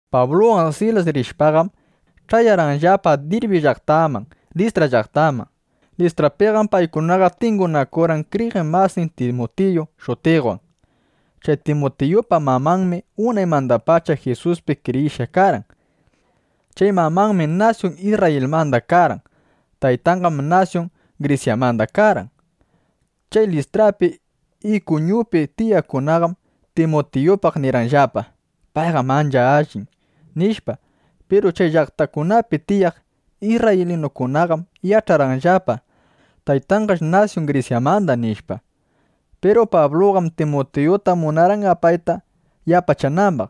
Pabluwan Silas rishpaqam, ch'ayarqanllapa Dirbi llaqtaman, Listra llaqtaman. Listrapiqam paykunaqa tingunakurqan kriyiq masin Timutiyu shutiqwan. Chay Timutiyupa mamanmi unaymandapacha Jisuspi kriyishqa karqan. Chay mamanmi nasyun Isrrayilmanda karqan. Taytanqam nasyun Grisyamanda karqan. Chay Listrapi, Ikuñupi tiyaqkunaqam Timutiyupaqqa nirqanllapa: “Payqam ancha allin”, nishpa. Piru chay llaqtakunapi tiyaq isrraylinukunaqam yach'arqanllapa: Taytanqash nasyun Grisyamanda. (Manam nasyunninchiq isrrayilmandachu), nishpa. Piru Pabluqam Timutiyuta munarqan apayta yapachanambaq.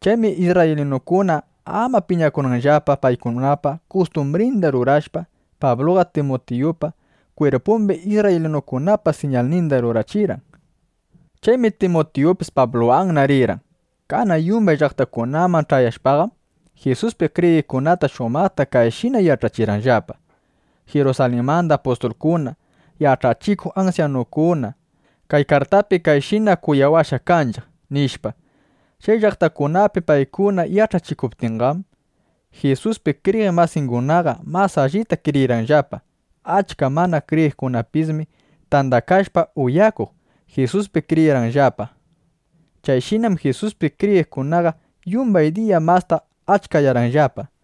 Chaymi isrraylinukuna ama piñakunanllapa, paykunapa kustumbrinda rurashpa, Pabluqa Timutiyupa kwirpumbi isrraylinukunapa siñalninda rurachirqan. Chaymi Timutiyupis Pabluwanna rirqan. Kanan yumbay llaqtakunaman ch'ayashpaqam, Jisuspi kriyiqkunata shumaqta kayshina yach'achirqanllapa: —Jirusalinmanda apustulkuna, yach'achikuq ansyanukuna kay kartapi kayshina kunawashqa kanchiq, nishpa. Chay llaqtakunapi paykuna yach'achikuptinqam, Jisuspi kriyiq masingunaqa mas allita kriyirqanllapa. Achka mana kriyiqkunapismi, tandakashpa uyakuq, Jisuspi kriyirqanllapa. Chayshinam Jisuspi kriyiqkunaqa yumbay diya masta achkayarqanllapa.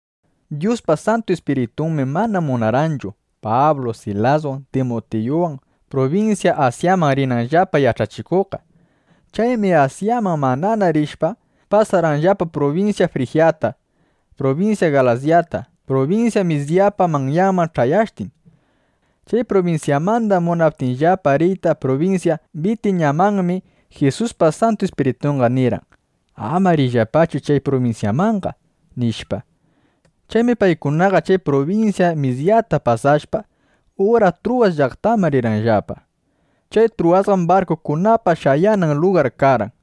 Dyuspa Santu Ispiritunmi mana munarqanchu Pablu Silaswan Timutiyuwan prubinsya Asyaman rinanllapa yach'achikuqqa. Chaymi Asyaman manana rishpa, pasarqanllapa prubinsya Frijyata, prubinsya Galasyata, prubinsya Misyapa manyanman ch'ayashtin. Chay prubinsyamanda munaptinllapa riyta prubinsya Bitiñamanmi, Jisuspa Santu Ispiritunqa nirqan: “Ama riyllapachu chay prubinsyamanqa”, nishpa. Chaymi paykunaqa chay prubinsya Misyata pasashpa, ura Truwas llaqtaman rirqanllapa. Chay Truwasqam barkukunapa shayanan lugar karqan.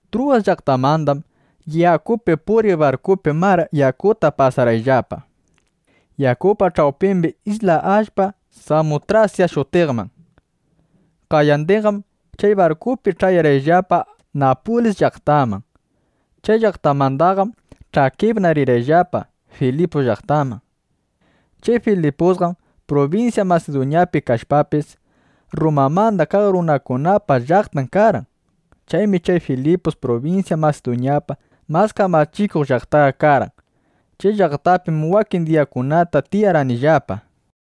Truwas llaqtamandaqam yakupi puriq barkupi mar yakuta pasarqayllapa yakupa ch'awpimbi isla allpa Samutrasya shutiqman. Qayandinqam chay barkupi ch'ayarqayllapa Napulis llaqtaman. Chay llaqtamandaqam ch'akipna rirqayllapa Filipus llaqtaman. Chay Filipusqam prubinsya Masiduñapi kashpapis, Rrumamanda kaq runakunapa llaqtan karqan. Chaymi chay Filipus prubinsya Masiduñapa mas kamachikuq llaqtan karqan. Chay llaqtapim wakin diyakunata tiyarqanillapa.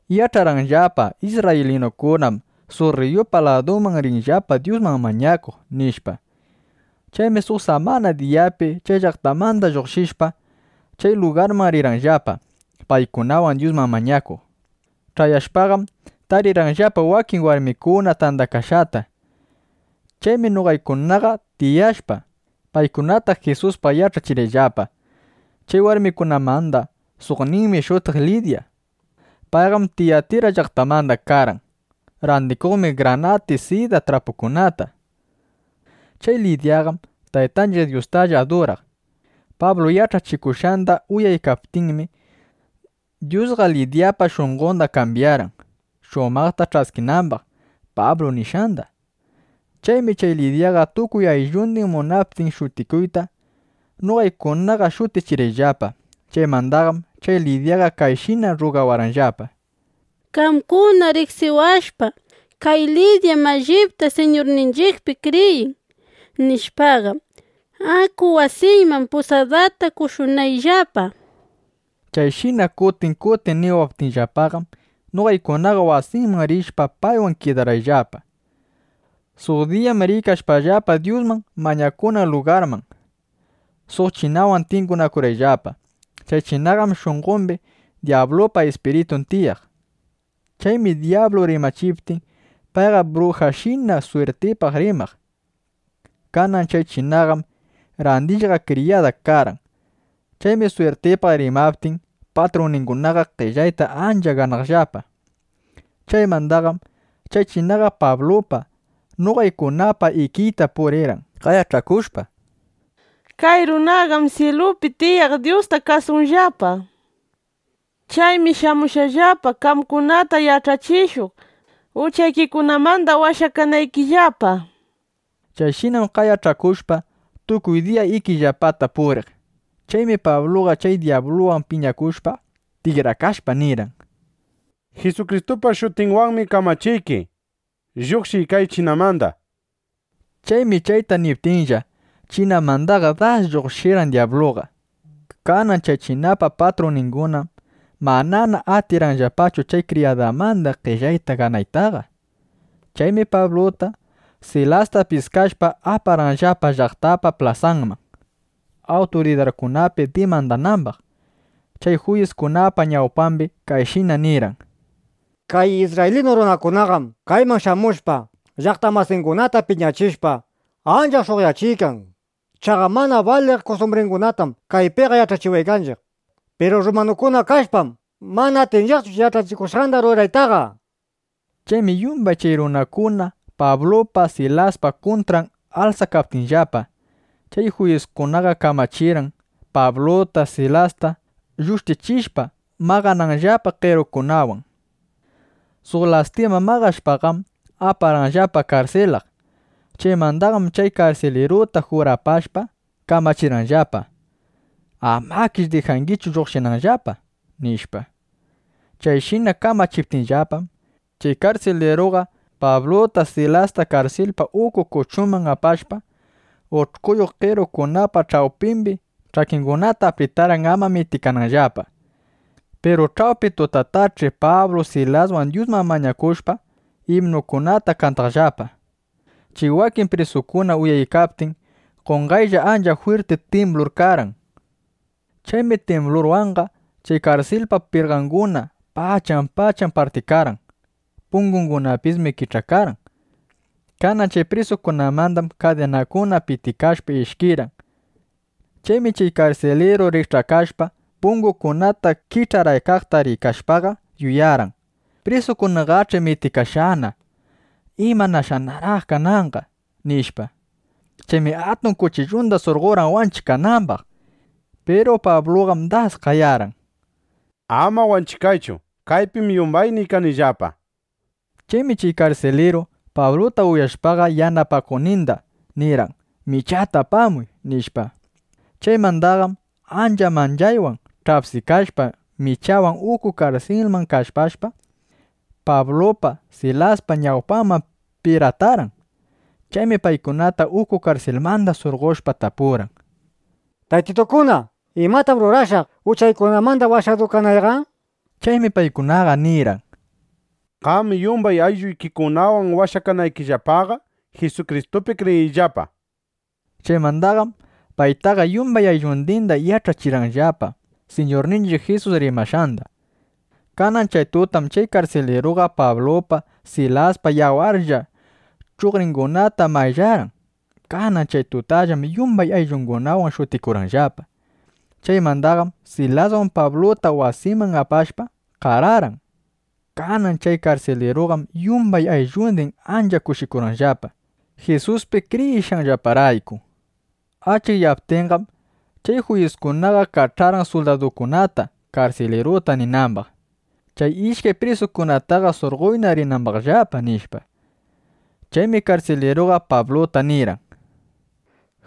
Yach'arqayllapa: Isrraylinukunam suq rriyupa ladunman rinllapa, Dyusman mañakuq, nishpa. Chaymi suq samana diyapi chay llaqtamanda lluqshishpa, chay lugarman rirqayllapa, paykunawan Dyusman mañakuq. Ch'ayashpaqam, tarirqayllapa wakin warmikuna tandakashqata. Chaymi noqaykunaqa tiyashpa, paykunata Jisuspaq yach'achirqayllapa. Chay warmikunamanda suqninmi shutirqan Lidya. Payqam Tiyatira llaqtamanda karqan. Randikuqmi granati sida trapukunata. Chay Lidyaqam Taytanchiq Dyustalla aduraq. Pablu yach'achikushqanda uyaykaptinmi, Dyusqa Lidyapa shunqonda kambyarqan, shumaqta ch'askinambaq Pablu nishqanda. Chaymi chay Lidyaqa tukuy ayllundin munaptin shutikuyta, noqaykunaqa shutichirqayllapa. Chaymandaqam chay Lidyaqa kayshina rrugawarqanllapa: —Qamkuna riqsiwashpa: Kay Lidyam allipta Siñurninchiqpi kriyin, nishpaqa, aku wasiyman, pusadata qoshunayllapa, nishpa. Chayshina kutin kutin niwaptinllapaqam, noqaykunaqa wasinman rishpa, paywan kidarqayllapa. Suq diyam riykashpallapa Dyusman mañakunan lugarman, suq chinawan tingunakurqayllapa. Chay chinapa shunqombim dyablupa ispiritun tiyaq. Chaymi dyablu rimachiptin, payqa brujashina swirtipaq rimaq. Kanan chay chinaqam randishqa kriyada karqan. Chaymi swirtipaq rimaptin, patrunningunaqa qellayta ancha ganaqllapa. Chaymandaqam chay chinaqa Pablupa, noqaykunapa ikiyta purirqan, qayach'akushpa: —¡Kay runakunaqam syilupi tiyaq Dyusta kasunllapa! ¡Chaymi shamushqallapa, qamkunata yach'achishuq, uchaykikunamanda washakanaykillapa! nishpa. Chayshinam qayach'akushpa, tukuy diya ikiyllapata puriq. Chaymi Pabluqa chay dyabluwan piñakushpa, tikrakashpa nirqan: —Jisukristupa shutinwanmi kamachiyki, lluqshiy kay chinamanda, nishpa. Chaymi chayta niptinlla, chinamandaqa das lluqshirqan dyabluqa. Kanan chay chinapa patrunningunaqam manana atirqanllapachu chay kriyadanmanda qellayta ganaytaqa. Chaymi Pabluta, Silasta piskashpa, aparqanllapa llaqtapa plasanman, awturidarkunapi dimandanambaq. Chay juyiskunapa ñawpambim kayshina nirqan: —Kay isrraylinu runakunaqam kayman shamushpa, llaqta masinchiqkunata piñachishpa, ancha sh'uqyachiykan. Chaqa mana baliq kustumbringunatam kaypiqa yach'achiwaykanchiq. Piru rrumanukuna kashpam, mana atinchiqchu chay yach'achikushqanda ruraytaqa, nishpa. Chaymi yumbay chay runakuna Pablupa Silaspa kuntran alsakaptinllapa, chay juyiskunaqa kamachirqan, Pabluta, Silasta llushtichishpa, maqananllapa qerukunawan. Suq lastima maqashpaqam, aparqanllapa karsilaq. Chaymandaqam chay karsiliruta jurapashpa, kamachirqanllapa: —Amakish dijangichu lluqshinanllapa, nishpa. Chayshina kamachiptinllapam, chay karsiliruqa Pabluta, Silasta karsilpa uku kuchunman apashpa, ush'kuyuq qerukunapa ch'awpimbi ch'akingunata apritarqan, ama mitikananllapa. Piru ch'awpi tutatach'i Pablu Silaswan Dyusman mañakushpa, imnukunata kantaqllapa. Chay wakin prisukuna uyaykaptin, qonqaylla ancha jwirti timblur karqan. Chaymi timblurwanqa chay karsilpa pirqangunaqa pachan pachan partikarqan. Pungungunapismi kich'akarqan. Kanan chay prisukunamandam kadinakuna pitikashpa, ishkirqan. Chaymi chay karsiliru rikch'akashpa, pungukunata kich'araykaqta rikashpaqa, yuyarqan: Prisukunaqach'i mitikashqana. ¿Imanashaqnar kananqa? nishpa. Chaymi atun kuchillunda surqorqan wanchikanambaq. Piru Pabluqam das qayarqan: —Ama wanchikaychu. Kaypim yumbayniy kanillapa, nishpa. Chaymi chay karsiliru, Pabluta uyashpaqa yanapakuqninda nirqan: —Michata apamuy, nishpa. Chaymandaqam ancha manchaywan ch'apsikashpa, michawan uku karsilman kallpashpa, Pablupa, Silaspa ñawpanman piratarqan. Chaymi paykunata uku karsilmanda surqoshpa, tapurqan: —Taytitukuna, ¿imatam rurashaq, uchaykunamanda washadu kanayqa? nishpa. Chaymi paykunaqa nirqan: —Qam yumbay aylluykikunawan washakanaykillapaqa Jisukristupi kriyiyllapa, nishpa. Chaymandaqam paytaqa, yumbay ayllundinda yach'achirqanllapa Siñurninchiq Jisus rimashqanda. Kanan chay tutam chay karsiliruqa Pablupa, Silaspa yawarlla chuqringunata mayllarqan. Kanan chay tutallam yumbay ayllungunawan shutikurqanllapa. Chaymandaqam Silaswan Pabluta wasinman apashpa, qararqan. Kanan chay karsiliruqam yumbay ayllundin ancha kushikurqanllapa, Jisuspi kriyishqanllaparayku. Achikyaptinqam, chay juyiskunaqa kach'arqan suldadukunata, karsiliruta ninambaq: —Chay ishkay prisukunataqa surqoyna rinambaqllapa, nishpa. Chaymi karsiliruqa Pabluta nirqan: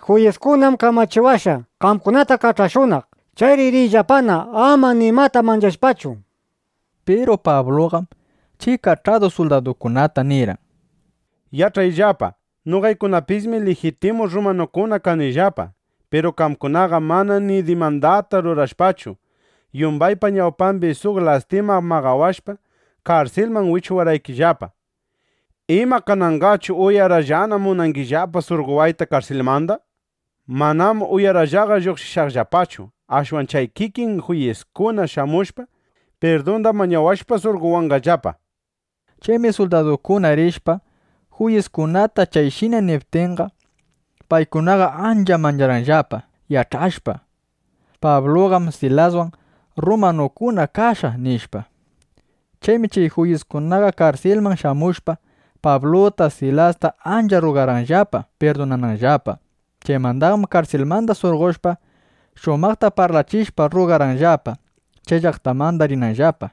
—Juyiskunam kamachiwashqa, qamkunata kach'ashunaq. Chayri riyllapana ama nimata manchashpachu, nishpa. Piru Pabluqam chay kach'adu suldadukunata nirqan: —Yach'ayllapa, noqaykunapismi lijitimu rrumanukuna kanillapa. Piru qamkunaqa mana ni dimandata rurashpachu, yumbaypa ñawpambi suq lastima maqawashpa, karsilman wichuwarqaykillapa. ¿Ima kananqachu uyarapllana (uyarallana) munangillapa surqowayta karsilmanda? ¡Manam uyarapllaqa lluqshishaqllapachu! Ashwan chay kikin juyiskuna shamushpa, pirdunda mañawashpa surqowanqallapa, nishpa. Chaymi suldadukuna rishpa, juyiskunata chayshina niptinqa, paykunaqa ancha mancharqanllapa, yach'ashpa: Pabluqam Silaswan rrumanukuna kashqa, nishpa. Chaymi chay juyiskunaqa karsilman shamushpa, Pabluta, Silasta ancha rrugarqanllapa pirdunananllapa. Chaymandaqam karsilmanda surqoshpa, shumaqta parlachishpa, rrugarqanllapa, chay llaqtamanda rinanllapa.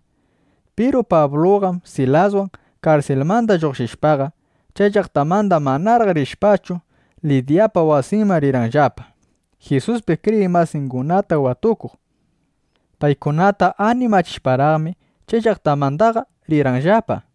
Piru Pabluqam Silaswan karsilmanda lluqshishpaqa, chay llaqtamanda manaraq rishpachu, Lidyapa wasinman rirqanllapa, Jisuspi kriyiq masingunata watukuq. Paykunata animachishparaqmi, chay llaqtamandaqa rirqanllapa.